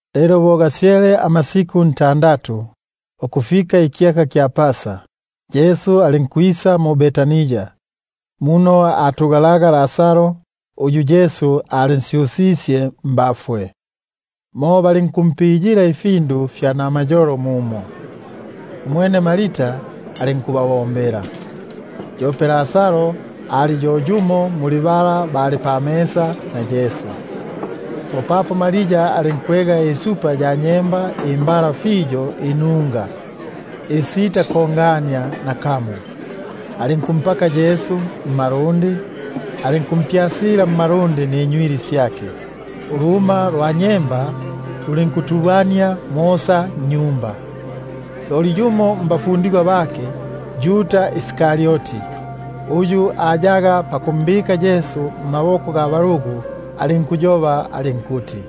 Lelo bo gasyele amasiku ntandatu ukufika Pasa, Yesu alinkwisa mu-Betania, muno alimo Lazaro uyu Yesu alinsyusisye mbafwe. Mo balinkumpiyila ifyakulya mumo; umwene Marta alinkubabombela, yope Lazaro ali yo yumo muli aba balyaga. Umwene Maria alinkwega ilatili#ilatili, bamo bikuti ipaundi (ubusito). yimo ya nyemba imbala fiyo inunga, isitakongania nakamo, alinkumpaka Yesu mmalundi, alinkumpyasila mmalundi ninywili syake; uluma lwa nyemba lulinkutubania mosa nnyumba. Loli yumo mbafundigwa bake, Yuda gwa mu-Karioti, uyu ayaga pakumbika mmaboko ga balugu, alinkuyoba alinkuti: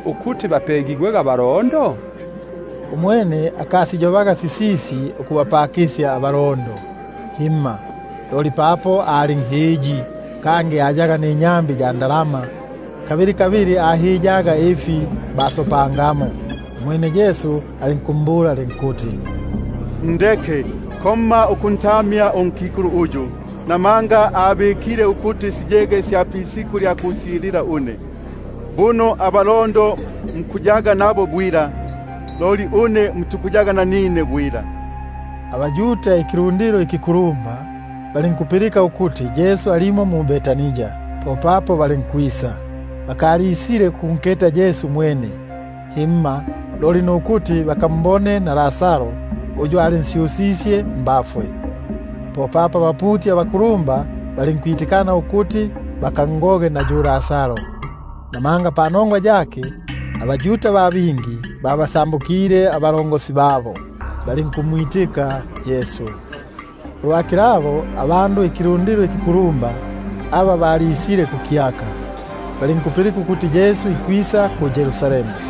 ukuti bapegigwege abalondo? Umwene akasiyobaga sisisi ukubapakisya abalondo, loli papo ali nhiyi, kangi papo ayaga ninyambi ya ndalama, alinkuhiya ifi basopangamo. Umwene Yesu alinkumbula alinkuti: Ndeke, buno abikile ukuti siyege sya pisiku lya kusyilila une. Namanga abalondo bo muli nabo bwila, loli une mukaya nanine bwila. Lelo abaYuda ikilundilo ikikulumba, balinkupilika ukuti alimo mumo, popapo balinkwisa; bakalisile kukunketa Yesu mwene, loli ukuti bakambone na Lazaro, uyu alinsyusisye mbafwe. Popapo abaputi abakulumba balinkwitikana ukuti bakangoge na yu Lazaro, namanga panongwa yake, abaYuda ba bingi basokile, balinkumwitika Yesu. Ulwa kilabo, abandu ikilundilo ikikulumba aba balisile kukyaka, bo bapilike ukuti Yesu ikwisa mu-Yerusalemu,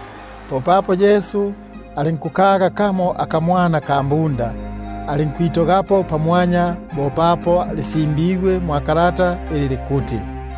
Popapo Yesu alinkukaga akapunda, alinkwitogapo. Bo papo lisimbigwe ili likuti: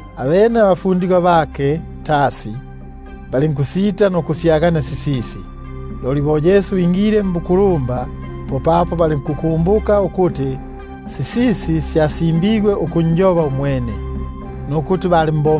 Abene abafundigwa bake balinkusita nukusyagania sisisi tasi; loli bo Yesu ingile mbukulumba, popapo balinkukumbuka ukuti sisisi syasimbigwe ukunjoba umwene, nukuti balimbo-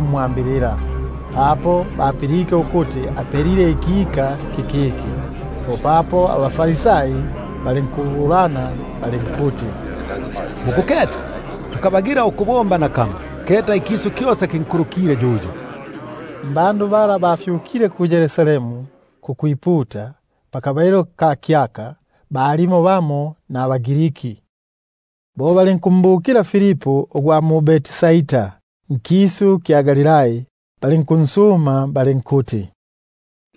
mwambilila, papo bapilike ukuti apelile ikika kikiki. Popapo abaFarisai balinkuyobesania balinkuti: Musibwene ukuti muli ba itolo; keta ikisu kyosa kinkulukile yuyo. Muli aba bafyukile kukwiputa kukyaka, balimo nabaGriki bamo. Bo balinkwisa kwa Filipu ugwa mu-Betsaida, nkisu kya Galilai, balinkunsuma balinkuti: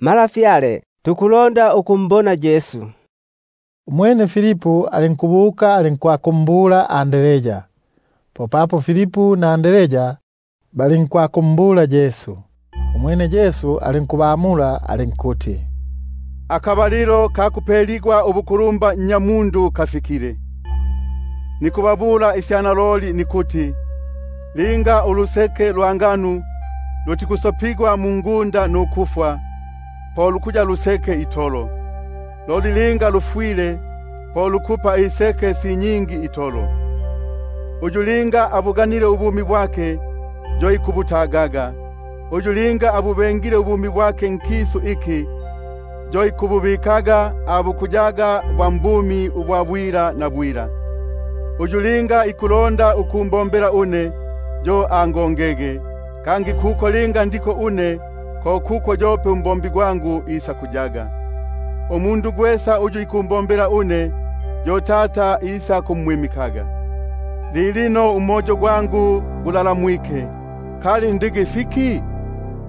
Malafyale, tukulonda ukunketa Yesu. Umwene Filipu alinkwakumbula Andrea, popapo Andrea na Filipu balinkwakumbula Yesu. Umwene Yesu alinkubamula alinkuti: Akabalilo kisile aka kupeligwa ukuya nkulumba Nnyamundu. Naloliloli nikubabula une nikuti, linga uluseke lwa nbano lutikusopigwa mungunda nukufwa, po lukuya lwene itolo; loli linga lukufwa, po lukupa iseke si nyingi itolo. Uyu linga abuganile ubumi bwake, yo ikubutagaga; kangi uyu linga ikububenga ubumi bwake nkisu iki, yo isakububatilaga ukufika kubumi bwa bwila. Uyu linga ikumbombela une, yo angongege; kangi kuno ndiko une, ko kuno yope umbombi gwangu isakuyaga. Uyu linga ikumbombela une, yo Tata isakumwimikaga. Lilino umoyo gwangu gulalamwike; kali ndigi fiki?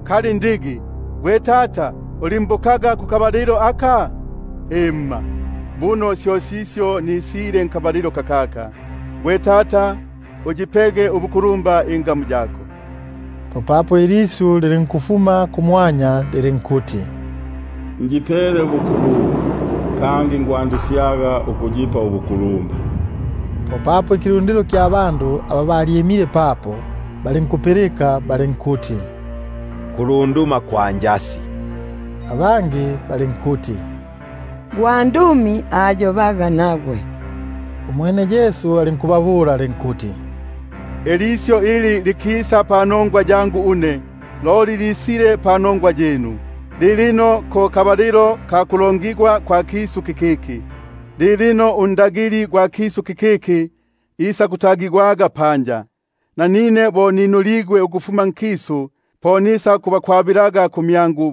Kali ndigi: Gwe Tata, ulimbokaga kukabalilo aka? Himma, buno syo sisyo nisile nkabalilo kakaka. Gwe Tata, uyipege ubukulumba ingamu yako. Popapo ilisyu lilinkufuma kumwanya lilinkuti: Njipele ubukulumba, kangi nikwandisyaga ukuyipa ubuku- lumba. Popapo ikilundilo iki kyalyimile papo, kilinkupilika, kilinkuti: Kulunduma kwa njasi; abangi balinkuti: Gwa- ndumi ayobaga nagwe. Umwene Yesu alinkubamula alinkuti: Ilisyu ili likisa panongwa yangu une, loli lisile panongwa yinu. Lilino ko kulongigwa kwa kisu kikiki; lilino unku- lumba gwa kisu kikiki isakutagigwaga panja. Nanine, linga ninuligwe ukufuma nkisu, po nisakubakwabilaga kumyangu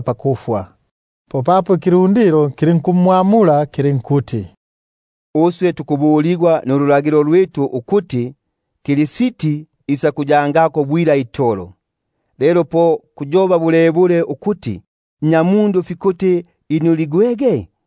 pakufwa. Popapo ikilundilo kilinkumwamula kilinkuti: Uswe tupilike ndulagilo, ukuti Kristi ikuyako bwila itolo; lelo po kuyoba bulebule ukuti, Nnyamundu fikuti inuligwege?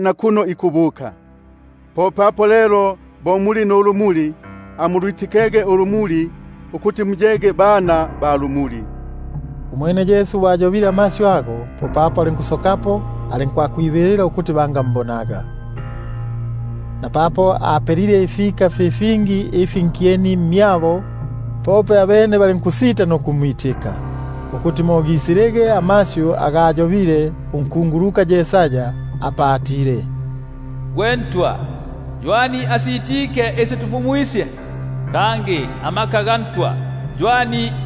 nakuno ikubuka. Bo muli nulumuli, po amulwitikege ulumuli, ukuti muyege bana ba lumuli. Umwene Yesu bo ayobile sisisi, popapo alinkusokapo, alinkwibilila ukuti bangambonaga. Napapo apelaga ifika fi fingi nkyeni mmyabo, loli abene balinkusita nukumwitika; ukuti mo lisilege ilisyu ili aliyobile unkunguluka Yesaya atile: Gwe Ntwa, ywani asitike isi tufumwisye? Kangi ikiboko kya Ntwa kinsetukile ywani?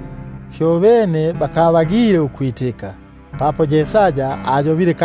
Fyobene bakabagile ukwitika; namanga Yesaya ayobile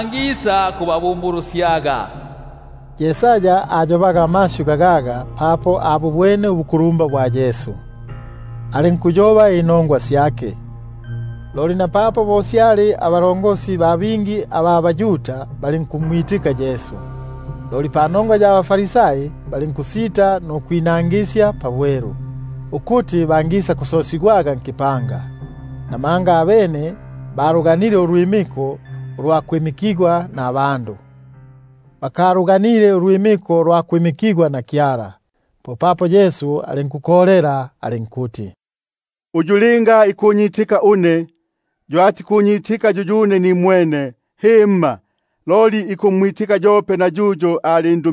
nisembabumbulusye. Sisisi syo ayobaga Yesaya papo abu- bwene ubukulumba bwake, apa anjobaga yuyo. Loli napapo bo syali, abakulumba ba bingi balinkumwitika; loli panongwa ya baFarisai, balinkusita nukwinangisya pabwelu, ukuti bangisakusosigwaga mu-Sinagogi. Namanga batuganile ulwimiko ukufuma kubandu, ukulukinda ulwimiko ulufuma kwa Kyala. Popapo Yesu alinkukolela alinkuti: Uyu linga ikunyitika une, yo atikunyitika yo yuyune, loli ikumwitika uyu alindu-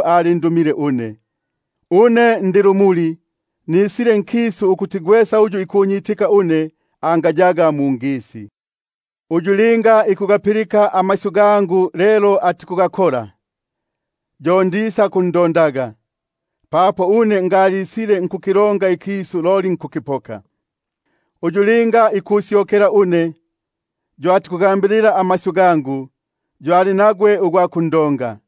alindumile une. Une nisile nkisu bo lu lumuli, ukuti gwesa uyu ikunyitika une, angayaga mungisi. Linga yumo ikugapilika amasyu gangu loli atikugabika, yo ndisakundonga; buno ngalisile nkukilonga ikisu, loli nkukipoka ikisu, Uyu linga ikusyokela une, uyu atikugambilila amasyu gangu, yo ali nagwe ugwa kundonga;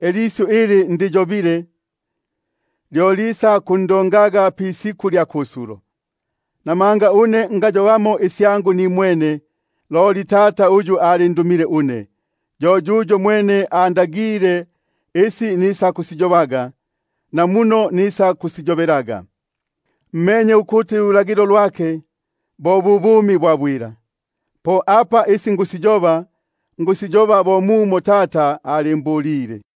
ilisyu ili ndiyobile, lyo lisakundo- ngaga pisiku lya kusulo. Buno une ngayobamo isyangu nimwene, loli Tata uyu alindumile une, yuyo mwene, yo andagile isi nisakusiyobaga, namuno nikusiyobelaga. Menye ukuti ululagilo lwake, bo bu bumi bwa bwila; po apa isi nikusiyoba, nikusiyoba bo mumo Tata alimbulile.